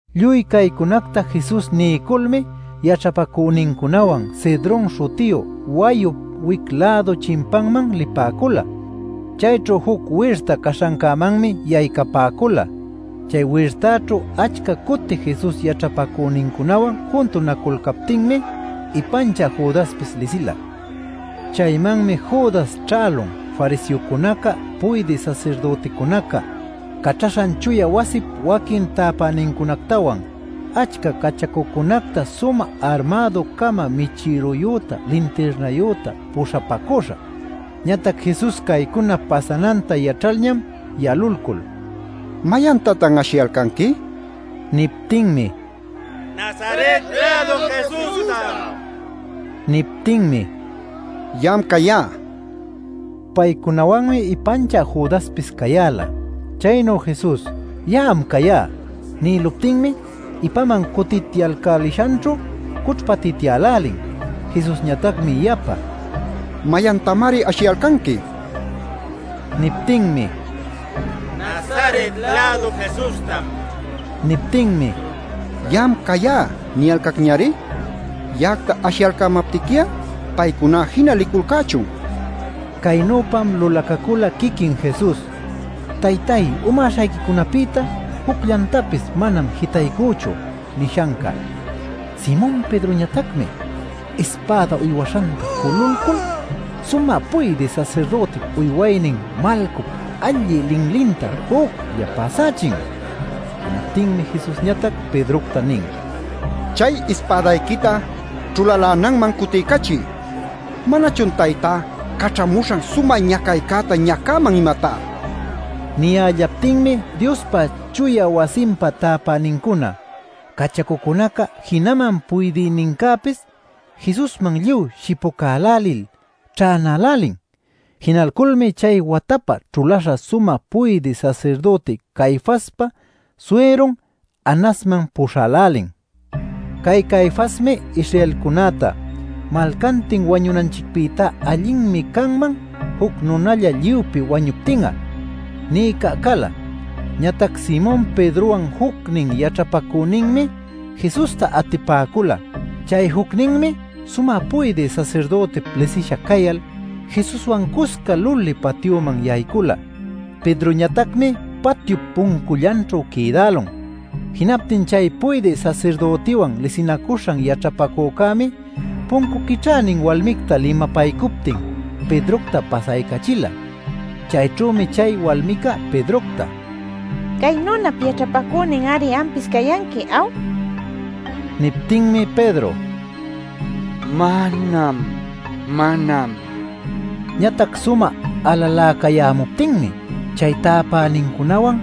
Lluy caycunacta Jesus niyculmi yaćhapacünincunawan Cedron śhutiyu wayup wic-lädu chimpanman lipäcula. Chayćhu juc wirta caśhancämanmi yaycapäcula. Chay wirtaćhu achca cuti Jesus yaćhapacünincunawan juntunaculcaptinmi ipanchä Judaspis lisila. Chaymanmi Judas ćhälun fariseocunaca puydï sasirdüticunaca caćhaśhan chuya wasip waquin täpänincunactawan achca cachacucunacta sumä armädu-cama michïrayüta lintirnayüta puśhapacüśha. Ñatac Jesus caycuna pasananta yaćhalñam yalulcul “¿Mayantatan ashiyalcanqui?” nin. Niptinmi: “Nazaret-lädu Jesustam” nipäcun. Niptinmi: “Ya'am cayá” nin. Paycunawanmi ipanchä Judaspis cayäla. Chaynu Jesus “Ya'am cayá” nïluptinmi ipaman cutityalcälishanćhu cućhpatityälälin. Jesusñatacmi yapa: “¿Mayantamari ashiyalcanqui?” nin. Niptinmi: “Nazaret-lädu Jesustam” nipäcun. Niptinmi: “Ya'am cayá niyalcacñari. Ya'acta ashiyalcämaptiqui'a paycuná jina liculcächun” nin. Caynüpam lulacacula quiquin Jesus: “Taytay umäśhayquicunapïta jucllantapis manam jitaycüchu” nishanca. Simon Pedroñatacmi ispäda uywaśhanta jululcul sumä puydï sasirdütip uywaynin Malcup allï linlinta juclla pasächin. Jinaptinmi Jesusñatac Pedrocta nin: “Chay ispädayquita ćhulalänanman cutiycachiy. ¿Manachun Taytá caćhamuśhan sumä ñacaycäta ñacäman, imatá?” nil. Niyällaptinmi Diospa chuya wasinpa täpänincuna, cachacucunaca jinaman puydïnincäpis Jesusman lluy shipucälälil ćhänälälin. Jinalculmi chay watapä ćhuläśha sumä puydï sasirdüti Caifaspa suyrun Anasman puśhälälin. Cay Caifasmi Israelcunäta “Malcantin wañunanchicpïtá allinmi canman juc nunalla lluypi wañuptin'a” nïca cala. Ñatac Simon Pedrowan jucnin yaćhapacüninmi Jesusta atipäcula. Chay jucninmi sumä puydï sasirdütip lisisha cayal Jesuswan cusca luli patyuman yaycula. Pedroñatacmi patyup puncullanćhu quïdälun. Jinaptin chay puydï sasirdütiwan lisinacuśhan yaćhapacücämi puncu quićhänin walmicta limapaycuptin Pedrocta pasaycachila. Chayćhümi chay walmica Pedrocta: “Cay nunap yaćhapacünin-ari ampis cayanqui ¿aw?” nin. Niptinmi Pedro: “¡Manam, manam!” nicuyan. Ñatac sumä alaläcayämuptinmi chay täpänincunawan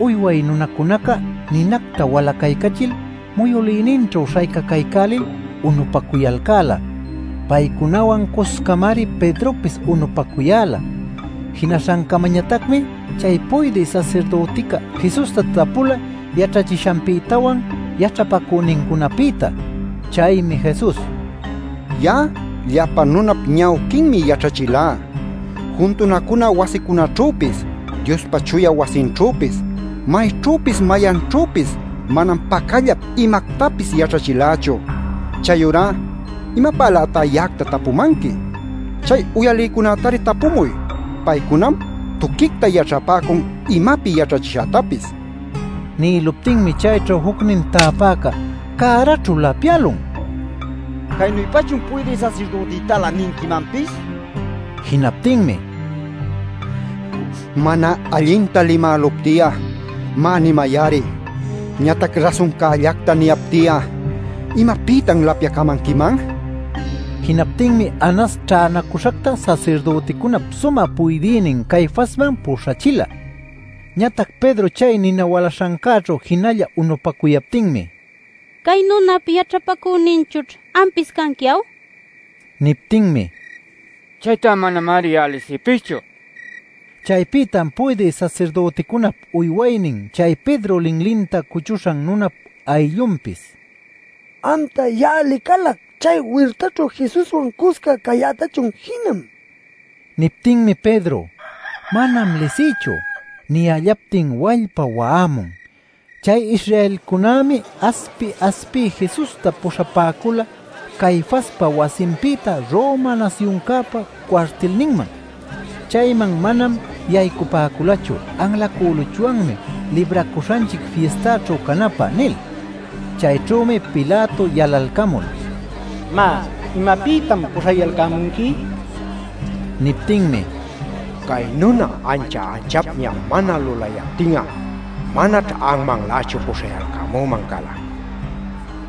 uyway nunacunaca ninacta walacaycachil muyülïninćhu śhaycacaycälil unupacuyalcäla. Paycunawan cuscamari Pedropis unupacuyäla. Jinaśhancamañatacmi chay puydï sasirdütica Jesusta tapula yaćhachishanpïtawan, yaćhapacünincunapïta. Chaymi Jesus: “Ya'a llapa nunap ñawquinmi yaćhachilá. Juntunacuna wasicunaćhüpis, Diospa chuya wasinćhüpis, mayćhüpis mayanćhüpis manam pacallap imactapis yaćhachilächu. ¿Chayurá imapälätá ya'acta tapumanqui? Chay uyalïcunätari tapumuy. Paycunam tuquicta yaćhapäcun imapi yaćhachishätapis” nin. Nïluptinmi chayćhu jucnin täpäca cäraćhu lapyälun “¿Caynüpachun puydï sasirdütïtalä ninquimanpis?” nil. Jinaptinmi: “Mana allinta limälupti'a, má, nimay-ari. Ñatac rasuncällacta niyapti'a ¿imapïtan lapyacamanquiman?” nin. Jinaptinmi Anas ćhänacüśhacta sasirdüticunap sumä puydïnin Caifasman puśhachila. Ñatac Pedro chay nina walaśhancäćhu jinalla unupacuyaptinmi “Cay nunap yaćhapacüninchućh ampis canqui, ¿aw?” nipäcun. Niptinmi: “Chayta manamari ya'a lisïpischu” nin. Chaypïtam puydï sasirdüticunap uywaynin chay Pedro linlinta cuchuśhan nunap ayllunpis: “¡Amta, ya'a licalac chay wirtaćhu Jesuswan cusca cayätachućh jinam!” nin. Niptinmi Pedro: “¡Manam lisïchu!” niyällaptin wallpa wa'amun. Chay Israelcunämi aspi-aspiy Jesusta puśhapäcula Caifaspa wasinpïta Roma nasyuncäpa cuartilninman. Chayman manam yaycapäculachu “Anlacüluchwanmi Libracuśhanchic Fistaćhu canapä” nil. Chayćhümi Pilato yalalcamul: “Má, ¿imapïtam puśhayalcämunqui?” nin. Niptinmi: “Cay nuna ancha anchapña mana lulaptin'a, manaćh anmanlächu puśhayalcämüman cala” nipäcun.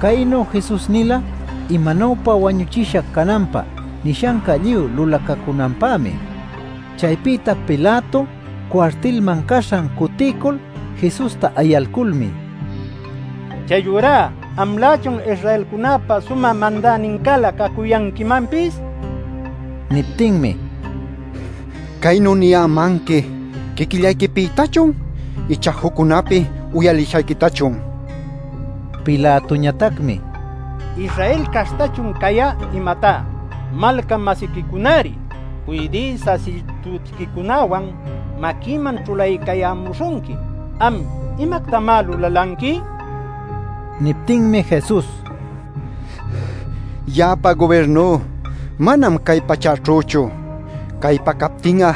Caynu Jesus nila imanuypa wañuchisha cananpä nishanca lluy lulacacunanpämi. Chaypïta Pilato cuartilman caśhan cutiycul Jesusta ayalculmi: “¿Chayurá amlächun Israelcunäpa sumä mandänincälä cacuyanquimanpis?” nin. Niptinmi: “¿Caynu niyämanqui quiquillayquipïtachun ichá juccunapi uyalishayquitachun?” nin. Pilatoñatacmi: “¿Israel caśhtachun cayá, imatá? Malca-masiquicunari, puydï sasirdütiquicunäwan maquïman ćhulaycayämuśhunqui. Am ¿imactamá lulalanqui?” nin. Niptinmi Jesus: “Ya'apa gubirnú manam cay pachäćhüchu. Caypa capti'a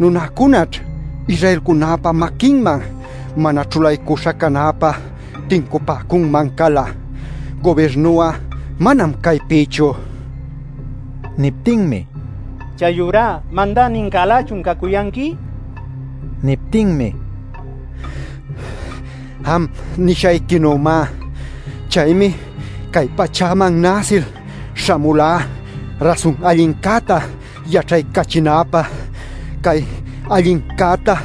nunäcunaćh Israelcunäpa maquinman mana ćhulaycuśha canäpä tincupäcunman cala. Gubirnu'a manam caypïchu” nin. Niptinmi: “Chayurá ¿mandänincälächun cacuyanqui?” nin. Niptinmi: “Am nishayquinümá. Chaymi cay pachäman näsil śhamulá rasun allincäta yaćhaycachinäpä. Cay allincäta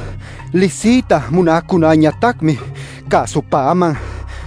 lisiyta munäcunäñatacmi cäsupäman” nin.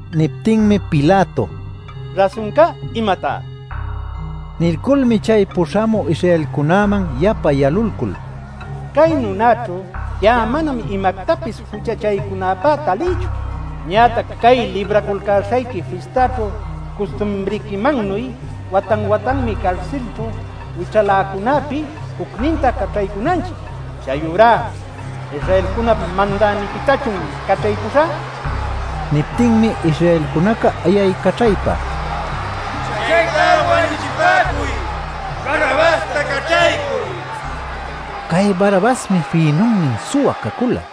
Niptinmi Pilato: “¿Rasuncá imatá?” nin. Nilculmi chay puśhamü Israelcunäman yapa yalulcul: “Cay nunäćhu ya'a manam imactapis juchachaycunäpä talïchu. Ñatac cay Libraculcäśhayqui Fistaćhu custumriquimannuy watan-watanmi carsilćhu wićhaläcunäpi jucninta caćhaycunanchic. Chayurá ¿Israelcunap Mandäniquitachun caćhaycuśhä?” nin. Niptinmi Israelcunaca ayaycaćhaypa: “¡Chaytá wañuchipäcuy! ¡Barrabasta caćhaycuy!” nicuyalcan. Cay Barrabasmi fïnunnin suwa cacula.